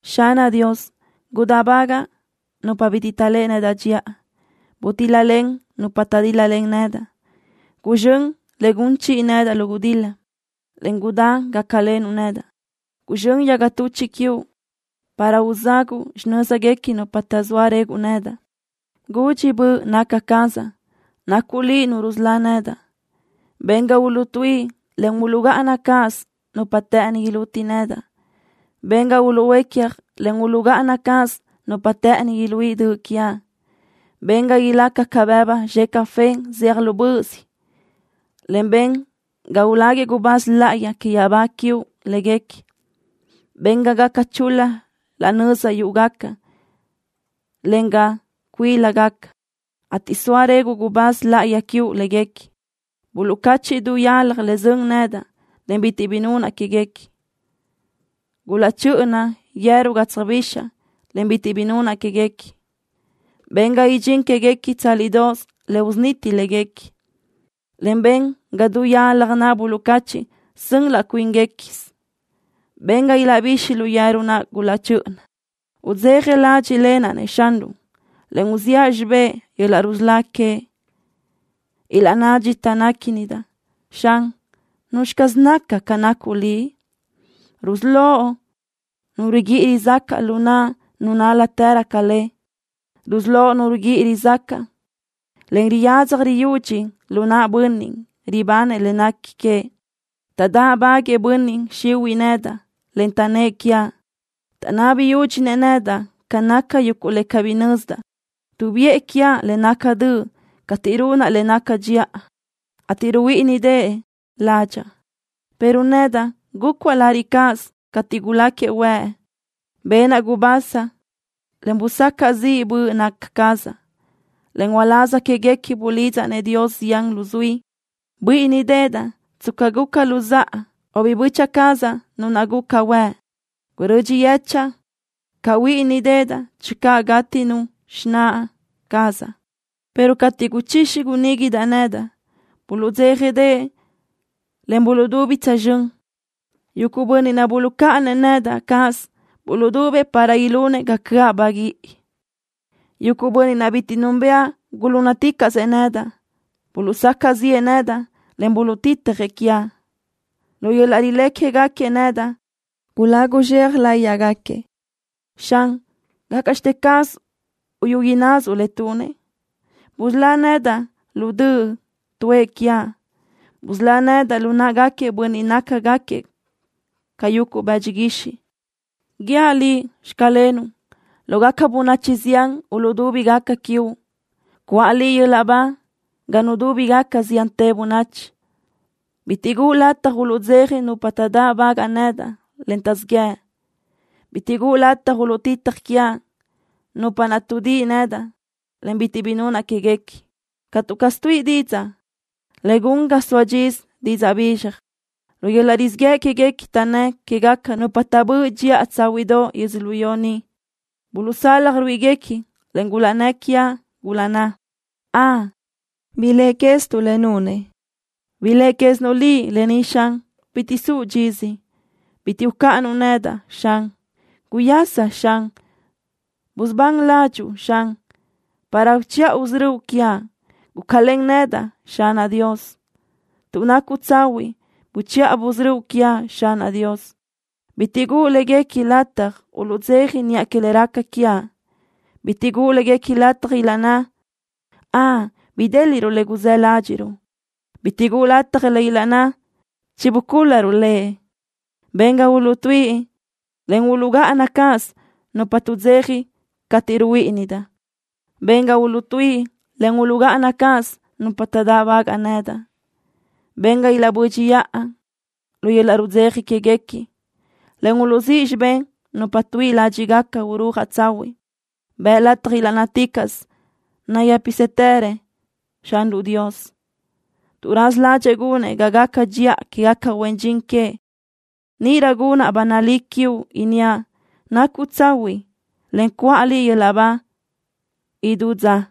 Xanaʼ Dios, gudáʼbagaʼ nupa bitiʼ taʼléʼe nedaʼ dxiʼa. Butíl-lalen nupa taʼdíl-lalen nedaʼ. Guzxö́n le gun chiʼi nedaʼ lu gudil-la, en gudá gácalenuʼ nedaʼ. Guzxö́n yaga tuchiʼ quiuʼ para uzaguʼu xinö́zguequi nupa taʼzóa reguʼ nedaʼ. Gudxi böʼ naca cazaʼ nacuʼ Liʼ Nu rusölá nedaʼ. Ben ga uluʼtuíʼi, en uluʼgáʼana cáʼasö nupa të́ʼëni iluti nedaʼ. Ben ga uluʼhuécaj, en uluʼgáʼana cáʼasö nupa të́ʼëni iluíʼi döʼ quiaʼ. Ben ga ilaca ca bëbu zxe café zeaj lu böʼös, en ben ga ulaguëʼ gubáz láʼayi que yaʼabá quiuʼ léguequi. Ben ga gaca chul-la nöza yúʼugaca, en ga cuílagaca, ateʼ soa réguʼë gubáz láʼayi quiuʼ léguequi. Buluʼcáchiʼ du yalaj le sön nedaʼ, en bitiʼ bi nunaʼ quéguequi. Gulaʼchö́ʼöna yeru ga tsöjbixaʼ, en bitiʼ bi nunaʼ quéguequi. Ben ga idxín quéguequi tsálidoʼos le usuniti léguequi, en ben ga du yalaj naʼ buluʼcáchiʼ sön laʼ cuínguequi quez. Ben ga ilaʼbixi lu yeru naʼ gulaʼchö́ʼöna. Udzeja ládxiʼlenaʼ-nëʼ Xanruʼ, en uziʼa xibé yöl-laʼ rusölá queëʼ. Ilaʼnná dxita néquinidaʼ: “Xan, ¿nuzxi caz naca ca nacuʼ Liʼ? Rusölóʼ nu riguíʼi rizácaʼ lu naʼ nu nál-latërö ca le. Rusölóʼ nu riguíʼi rizácaʼ, en riyadzaj riyudxi lu naʼ bönniʼ ribanëʼ le nequi que.” Taʼdáʼbaguëʼë bönniʼ xihuiʼ nedaʼ, en taʼnnë́ʼ quiaʼ. Taʼnabi yúdxinëʼ nedaʼ ca naca yuguʼ le cabí nözdaʼ. Tuʼbiʼë quiaʼ le naca döʼ cateʼ runaʼ le naca dxiʼa, ateʼ ruhuíʼinideʼe ládxaʼa. Pero nedaʼ gúcuaʼ lariʼ cáʼasö cateʼ guláquiëʼ huëʼ. Benaʼ gubasa, en busacaʼ ziʼ böʼ naca cazaʼ, en uláz quéguequi bulidzaʼ-nëʼ Dios zián luzuí. Buíʼinideʼedaʼ tsca guca luzáʼa o biʼi böchiʼ cazaʼ nu naʼ guca huëʼ. Gurödxi yechaʼa ca huíʼinideʼedaʼ channö gátinu xináʼ cazaʼ, pero cateʼ guchixi guníguidaʼ nedaʼ, buluʼdzéjadeʼe, en buluʼdubi tsözxö́n. Yuguʼ bönniʼ naʼ buluʼcáʼanëʼ nedaʼ cáʼasö buluʼdubëʼ para ilunëʼ ga cöʼa baguíʼi. Yuguʼ bönniʼ naʼ bitiʼ núnbëʼa gulúnnaticaʼsëʼ nedaʼ. Buluʼsacaʼ ziʼë nedaʼ, en buluʼtitjëʼ quiaʼ. Lu yöl-laʼ rilé quégaquiëʼ nedaʼ gulagu zxea láyiʼgaquiëʼ. Xan, ¿gácaʼxte caz uyú ináʼasuʼ le tunëʼ? Busölá nedaʼ lu döʼ tuʼë quiaʼ. Busölá nedaʼ lu náʼagaquiëʼ bönniʼ naʼ nácagaquiëʼ ca yuguʼ bëdxi guixiʼ. Guíaʼ Liʼ: “Xclenuʼ” lógaca bönachi zián uluʼdúbigaca quiuʼ. Cuʼa Liʼ yöl-laʼ ba ga nudúbigaca ziantë bönachi. Bitiʼ guʼu lataj uluʼdzeja nupa taʼdáʼbagaʼ nedaʼ, en taʼzíʼ yëʼ, en bitiʼ guʼu lataj uluʼtitaj quiaʼ, nupa naʼ tuʼdíʼi nedaʼ, en bitiʼ bi nunaʼ quéguequi. Catu caz tuíʼi didzaʼ le gun ga soa dxisö didzaʼ bizxaj. Lu yöl-laʼ rizíʼ yëʼ quéguequi taʼnnë́ quégaca nupa taʼbö́ʼ dxiʼa tsáhuiʼdoʼ yödzölió ni. Buluʼsalaj ruíʼiguequi, en gulaʼnnë́ quiaʼ, gulaʼnná: “¡Ön, biléʼe quézituʼ le nunëʼ!” ¡Biléʼe quézinuʼ Liʼ lë ni, Xan! ¡Bitiʼ suʼ dxisö! ¡Bitiʼ ucáʼanuʼ nedaʼ, Xan! ¡Guyasa, Xan! ¡Busubán ládxuʼu, Xan, para uchiʼa usörö́uʼ quiaʼ! ¡Gúcalen nedaʼ, Xanaʼ Dios! ¡Tuʼ nacuʼ tsahuiʼ, buchiʼa busörö́ quiaʼ, Xanaʼ Dios! ¡Bitiʼ guʼu léguequi lataj uluʼdzeja niʼa que le raca quiaʼ! ¡Bitiʼ guʼu léguequi lataj ilaʼnná: “Ön, bidéliʼruʼ le guzë́ ládxiʼruʼ”! ¡Bitiʼ guʼu lataj ilaʼnná: “Chibucúl-laruʼ lëʼ”! ¡Ben ga uluʼtuíʼi, en uluʼgáʼana cáʼasö nupa tuʼdzeja cateʼ ruhuíʼinidaʼ! ¡Ben ga uluʼtuíʼi, en uluʼgáʼana cáʼasö nupa taʼdáʼbagaʼ nedaʼ! ¡Ben ga ilaʼbö́dxiʼa lu yöl-laʼ rudzeja quéguequi, en uluʼzíʼ xibé nupa tuíʼi ládxiʼgaca urúajaʼ tsahuiʼ! ¡Bëʼ lataj ilaʼnnáticaʼsö: “Nayë́pisëtërëʼ Xanruʼ Dios, tuʼ raza ládxëʼë gunëʼ ga gaca dxiʼa quégaca huen dxin queëʼ”! Níʼirö gunaʼ ba nalí quiuʼ, inníaʼ: “¡Nacuʼ tsahuiʼ!” en cuʼa Liʼ yöl-laʼ ba idú dza.